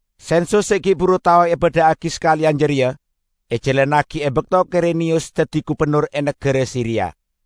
Sensus se gi' buru tao ebadha'agi sakaleyan jareya ejalannagi e bakto Kireniyus daddi gubennor e nagara Siria.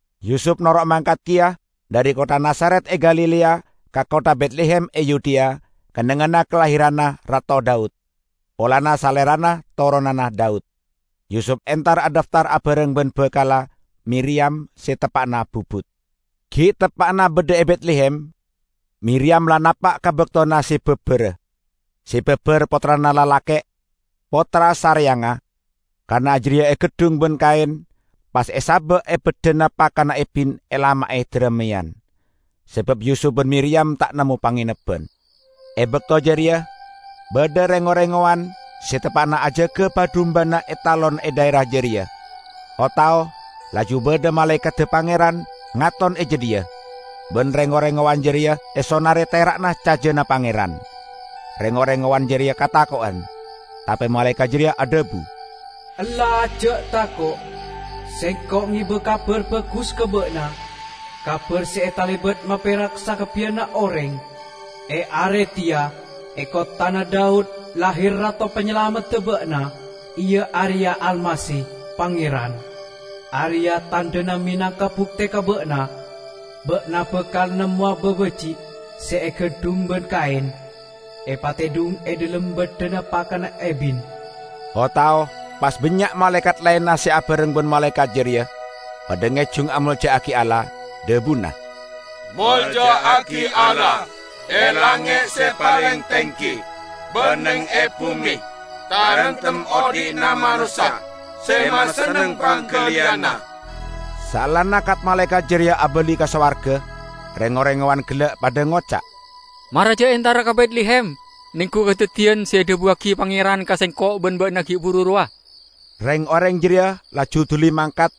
Yusup noro' mangkat keya dhari kottha Nazaret e Galilea, ka kottha Betlehem e Yudea, kennengnganna kalahiranna Rato Daud; polana salerana toronanna Daud. Yusup entar adhaftar abareng ban bakalla, Miriyam, se teppa'na bubut. Gi' teppa'na badha e Betlehem, Miriyam la napa' ka baktona se babara. Se babar pottrana lalake', pottra sareyangnga. Kana' jareya egeddhung ban kaen, pas esaba' e baddhana pakanna ebin elama'e darameyan, sabab Yusup ban Miriyam ta' nemmo pangenebban. E bakto jareya badha reng-oreng ngowan se teppa'na ajaga ba-dumbana e talon e dhaera jareya. O-tao laju badha malaekadda Pangeran ngaton e jadhiya, ban reng-oreng ngowan jareya esonare tera'na cajana Pangeran. Reng-oreng ngowan jareya katako'en. Tape malaekat jareya adhabu, "Ella ja' tako'! Sengko' ngeba kabar bagus ka ba'na, kabar se talebat maperak sakabbiyanna oreng. E are teya e kotthana Daud lahir Rato Panyalamedda ba'na, iya areya Almasih, Pangeran! Areya' tandhana menangka bukte ka ba'na: Ba'na bakal nemmowa babaji' se egeddhung ban kaen, epatedhung e dhalem baddhana pakanna ebin." O-tao pas bannya' malaekat laenna se abareng ban malaekat jareya, padha ngejung amolja'agi Allah, dhabuna, "Molja'agi Allah e langnge' se paleng tenggi! Ban neng e bume, taremtem odhi'na manossa se masenneng panggaliyanna!" Saellana kat-malaekat jareya abali ka sowarga, reng-oreng ngowan gella' padha ngoca', "Mara ja' entara ka Betlehem nenggu kadaddiyan se edhabuwagi Pangeran ka sengko' ban ba'na gi' buru rowa." Reng-oreng jareya laju duli mangkat,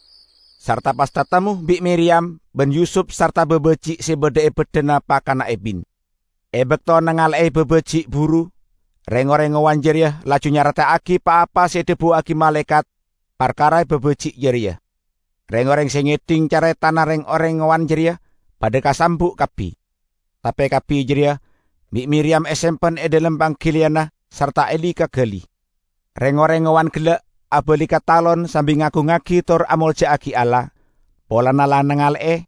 sarta pas tatemmo bi' Miriyam ban Yusup sarta babaji' se badha e baddhana pakanna ebin. E bakto nangale'e babaji' buru, reng-oreng ngowan jareya laju nyareta'agi pa-apa se edhabuwagi malaekat parkara babaji' jareya. Reng-oreng se ngedhing caretana reng-oreng ngowan jareya padha kasambu' kabbi. Tape kabbi jareya bi' Miriyam esempen e dhalem panggaliyanna sarta eli-kagali. Reng-oreng ngowan gella' abali ka talon sambi ngagungngagi tor amolja'agi Allah, polana la nangale'e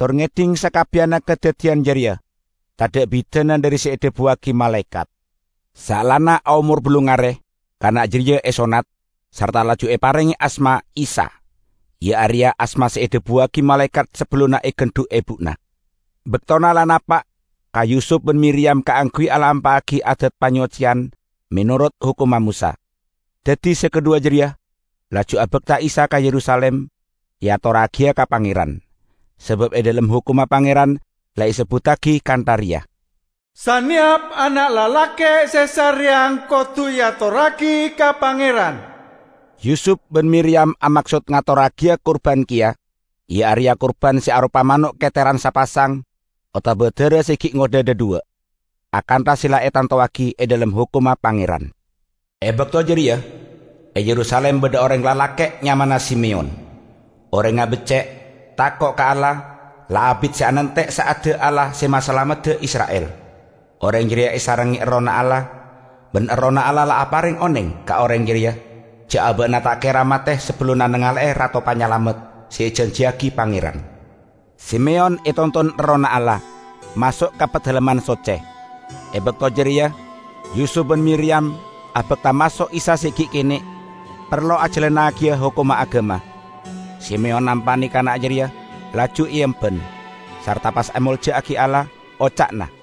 tor ngedhing sakabbiyanna kadaddiyan jareya, tadha' bidana dhari se edhabuwagi malaekat. Saellana aomor ballung are, kana' jareya esonnat, sarta laju eparenge asma Isa, iya areya asma se edhabuwagi malaekat sabellunna egandhu' ebuna. Baktona la napa' ka Yusup ban Miriyam kaangguy alampa'agi adat panyocceyan menorot hokomma Mosa. Daddi se kadhuwa jareya laju abakta Isa ka Yerusalim, eatorragiya ka Pangeran. Sabab e dhalem hokomma Pangeran la esebbuttagi kantha reya, "Saneyap ana' lalake' se sareyang kodu eatorragi ka Pangeran." Yusup ban Miriyam amaksod ngatorragiya kurban keya, iya areya kurban se aropa mano' keteran sapasang otaba dara se gi' ngodha dhadhuwa', akantha se la etantowagi e dhalem hokomma Pangeran. E bakto jareya e Yerusalim badha oreng lalake' nyamana Simeyon. Orengnga becce', tako' ka Allah; la abit se anante' sa'adda Allah se masalamedda Isra'il. Oreng jareya esarengnge Errohna Allah, ban Errohna Allah la apareng oneng ka oreng jareya ja' aba'na ta' kera mate sabellunna nangale'e Rato Panyalamet se ejanjiyagi Pangeran. Simeyon etonton Errohna Allah, maso' ka Padalemman Socce. E bakto jareya Yusup ban Miriyam abakta maso' Isa se gi' kene' parlo ajalannagiya hokomma agama. Simeyon nampane kana' jareya laju eemban, sarta pas amolja'agi Allah, oca'na,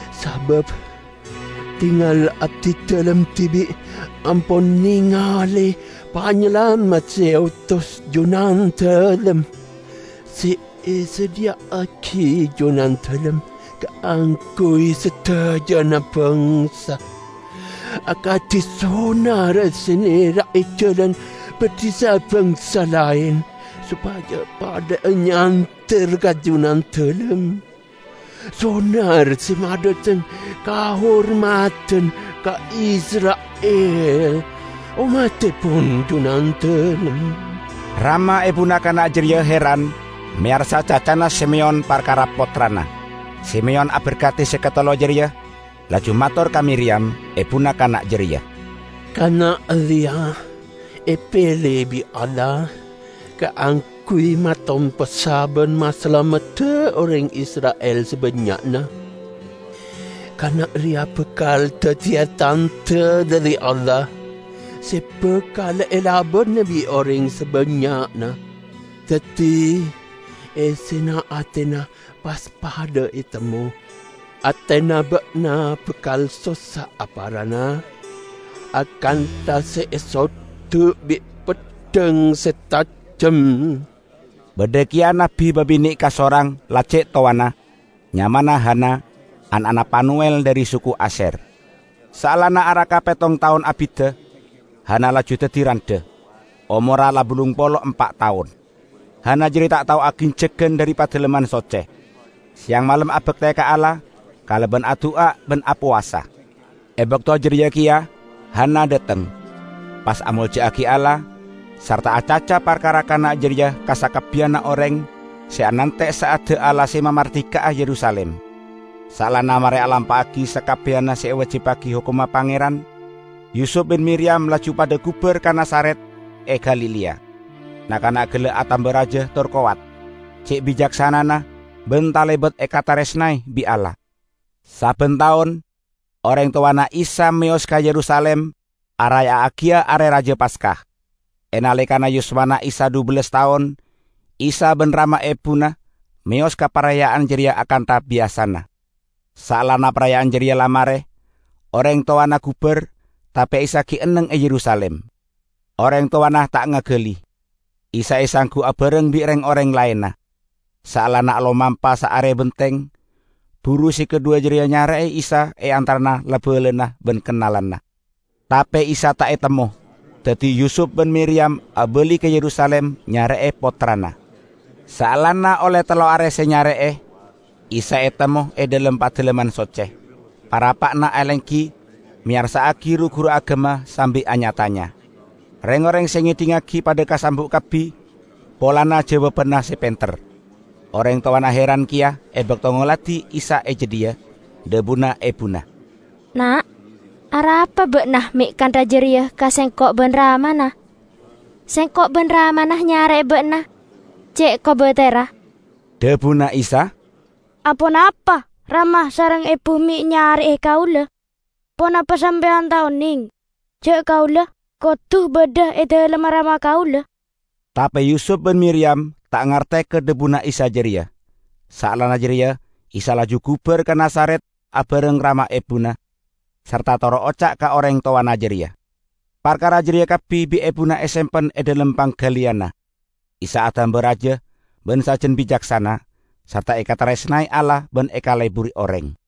Sabab tengal abdidalem dibi' ampon nengale Panyalamet se eotos Junandalem, se esadhiya'agi Junandalem kaangguy sadajana bangsa: akadi sonar se nera'e jalan badhi sa-bangsa laen sopaja padha'a nyander ka Junandalem, sonar se madhateng kahormadan ka Isra'il ommattepon Junandalem." Rama ebuna kana' jareya heran meyarsa cacana Simeyon parkara pottrana. Simeyon aberkadi se katello jareya, laju mator ka Miriyam, ebuna kana' jareya, "Kana' reya epele bi' Allah kaangguy matompessa ban masalamedda oreng Isra'il sabannya'na. Kana reya bakal daddiya tandha dhari Allah, se bakal elabana bi' oreng sabannya'na, daddi essena atena pas padha etemmo. Atena ba'na bakal sossa'a parana akantha se esoddu' bi' peddhang se tajem." Badha keya nabbi babine' kasorang la ce' towana. Nyamana Hana, ana'na Panuwel dhari suku Asyer. Saellana araka pettong taon abidda, Hana laju daddi randha; omorra la ballung polo empa' taon. Hana jareya ta' tao aginjeggan dhari Padalemman Socce. Seyang malem abakte ka Allah kalaban adu'a ban apowasa E bakto jareya keya Hana dhateng, pas amolja'agi Allah sarta acaca parkara kana' jareya ka sakabbiyanna oreng se anante' sa'adda Allah se mamardika'a Yerusalim. Saellana mare alampa'agi sakabbiyanna se ewajibbagi Hokomma Pangeran, Yusup ban Miriyam laju padha gubar ka Nazaret e Galilea. Na'-kana' gella' atamba raja tor kowat, ce' bicaksanana ban talebat ekataresnae bi' Allah. Sabban taon oreng towana Isa meyos ka Yerusalim araya'agiya Are Raja Paska. E naleka yuswana Isa dhubellas taon, Isa ban rama ebuna meyos ka paraya'an jareya akantha biyasana. Saellana paraya'an jareya la mare, oreng towana gubar, tape Isa gi' enneng e Yerusalim. Oreng towana ta' ngagali. Isa esanggu abareng bi' reng-oreng laenna. Saellana alomampa saare benteng, buru se kadhuwa jareya nyare'e Isa e antarana la-balana ban kennalanna. Tape Isa ta' etemmo, daddi Yusup ban Miriyam abali ka Yerusalim nyare'e pottrana. Saellana olle tello are se nyare'e, Isa etemmo e dhalem Padalemman Socce, parappa'na alenggi, meyarsa'agi ru-guru agama sambi anya-tanya. Reng-oreng se ngedhingngagi padha kasambu' kabbi polana jawabanna se penter. Oreng towana heran keya e bakto ngoladi Isa e jadhiya. Dhabuna ebuna, "Na', arapa Ba'na me' kantha jareya ka sengko' ban ramana? Sengko' ban ramana nyare'e ba'na, ce' kobaterra." Dhabuna Isa, "Aponapa rama sareng ebu me' nyare'e kaula? Ponapa sampeyan ta' oneng ja' Kaula kodu badha e dalemma Rama Kaula?" Tape Yusup ban Miriyam ta' ngarte ka dhabuna Isa jareya. Saellana jareya Isa laju gubar ka Nazaret abareng rama ebuna, sarta toro' oca' ka oreng towana jareya. Parkara jareya kabbi bi' ebuna esempen e dhalem panggaliyanna. Isa atamba raja ban sajan bicaksana, sarta ekataresnae Allah ban ekaleburi oreng.